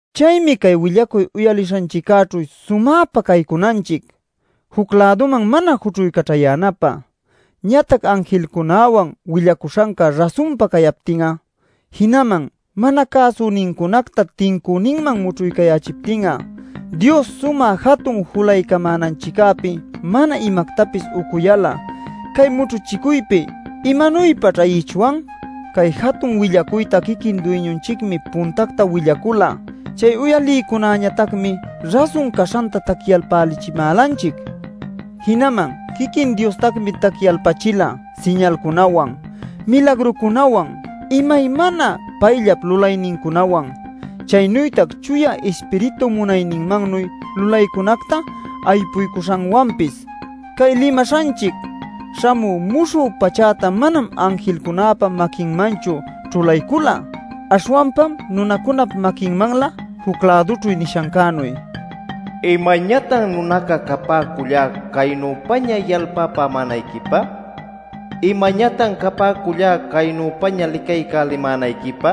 Chaymi cay willacuy uyalishanchiccäćhu sumäpa caycunanchic, juc-läduman mana jućhuycaćhayänapä. Ñatac anjilcunäwan willacuśhanca rasunpa cayaptin'a, jinaman mana cäsucünincunacta tincüninman mućhuycayächiptin'a, Dios sumä jatun julaycamänanchiccäpi mana imactapis ucuyal'a cay mućhuchicuypi ¿imanuypaćh ayichwan? Cay jatun willacuyta quiquin Duyñunchicmi puntacta willacula. Chay uyalïcunäñatacmi rasun caśhanta tacyalpälichimälanchic. Jinaman quiquin Diostacmi tacyalpachila siñalcunawan, milagrucunawan, imaymana payllap lulaynincunawan, chaynütac Chuya Ispiritu munayninmannuy lulaycunacta aypuycuśhanwanpis. Cay limaśhanchic śhamü muśhü pachäta manam anjilcunäpa maquinmanchu ćhulaycula. Aśhwanpam nunacunap maquinmanlä juc-lädućhu nishancänuy: “¿Imañatan nunaca capäcullá caynüpaña yalpapämänayquipä? ¿Imañatan capäcullá caynüpaña licaycälimänayquipä?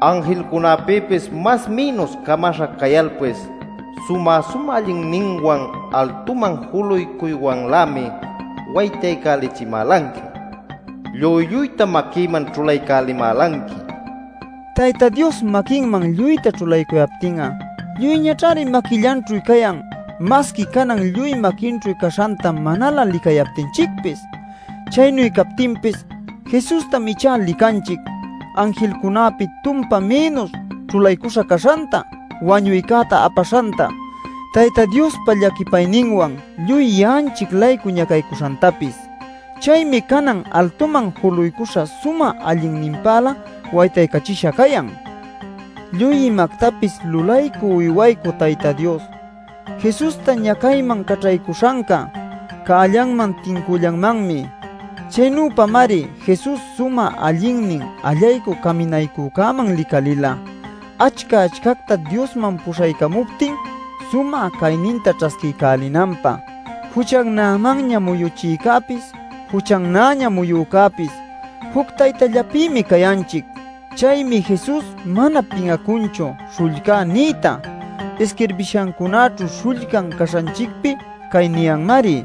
Anjilcunäpïpis mas mïnus camaśha cayalpis ¡sumä-sumä allinninwan altuman juluycuywanlämi waytaycälichimälanqui! ¡Lluy lluytam maquïman ćhulaycälimälanqui!” nil. Tayta Dios maquinman lluyta ćhulaycuyaptin'a lluyñaćhari maquillanćhu cayan masqui canan lluy maquinćhu caśhanta manalä licayaptinchicpis. Chaynu captinpis, Jesustam ichá licanchic, anjilcunäpi tumpa mïnus ćhulaycuśha caśhanta, wañuycäta apaśhanta, Tayta Diospa llaquipayninwan lluy ya'anchic-laycu ñacaycuśhantapis. Chaymi canan altuman juluycuśha sumä allinninpälä waytaycachisha cayan. Lluy imactapis lulaycü uywaycü Tayta Dios Jesusta ñacayman caćhaycuśhanca cällanman tincüllanmanmi. Chaynüpamari Jesus sumä allinnin Allaycü Caminaycücäman licalila achca-achcacta Diosman puśhaycamuptin sumä cayninta ćhasquiycälinanpä. Juchannämanña muyuchïcäpis, juchannäña muyücäpis juc taytallapïmi cayanchic. Chaymi Jesus mana pin'acunchu “śhullcá” niyta. Isquirbishacunaćhu śhullcan caśhanchicpi cay niyanmari: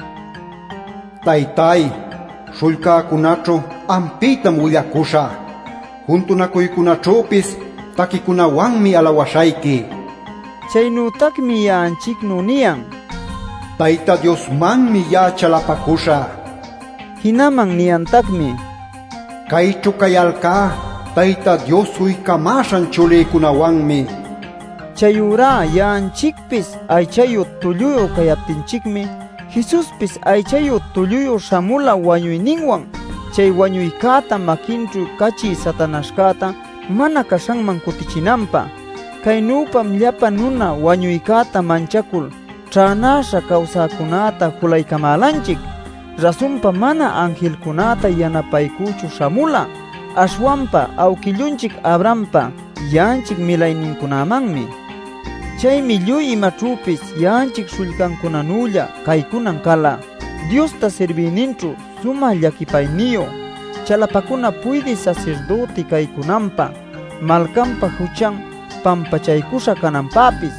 “Taytáy, śhullcäcunaćhu ampïtam willacuśhä; juntunacuycunaćhüpis taquicunawanmi alawaśhayqui” nil. Chaynütacmi ya'anchicnu niyan: “Tayta Diosmanmi ya'a chalapacuśhä” nil. Jinaman niyantacmi: “Cayćhu cayalcá Tayta Dios uycamäśhan chulïcunawanmi” nil. Chayurá ya'anchicpis aychayu tulluyu cayaptinchicmi, Jesuspis aychayu tulluyu śhamula wañuyninwan chay wañuycäta maquinćhu cachï Satanaśhcäta mana caśhanman cutichinanpä. Caynüpam llapa nuna wañuycäta manchacul ćhänäśha cawsäcunäta julaycamälanchic. Rasunpa, manam anjilcunäta yanapaycüchu śhamula, aśhwanpa awquillunchic Abrahampa ya'anchic milaynincunämanmi. Chaymi lluy imaćhüpis ya'anchic śhullcancunanülla caycunan cala Diosta sirbïninćhu sumä llaquipayniyu, chalapacuna puydï sasirdüti caycunanpä, malcanpa juchan pampachaycuśha cananpäpis.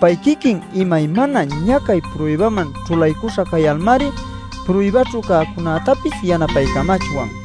Pay quiquin imaymana ñacay pruybaman ćhulaycuśha cayalmari, pruybaćhu cäcunätapis yanapaycamachwan.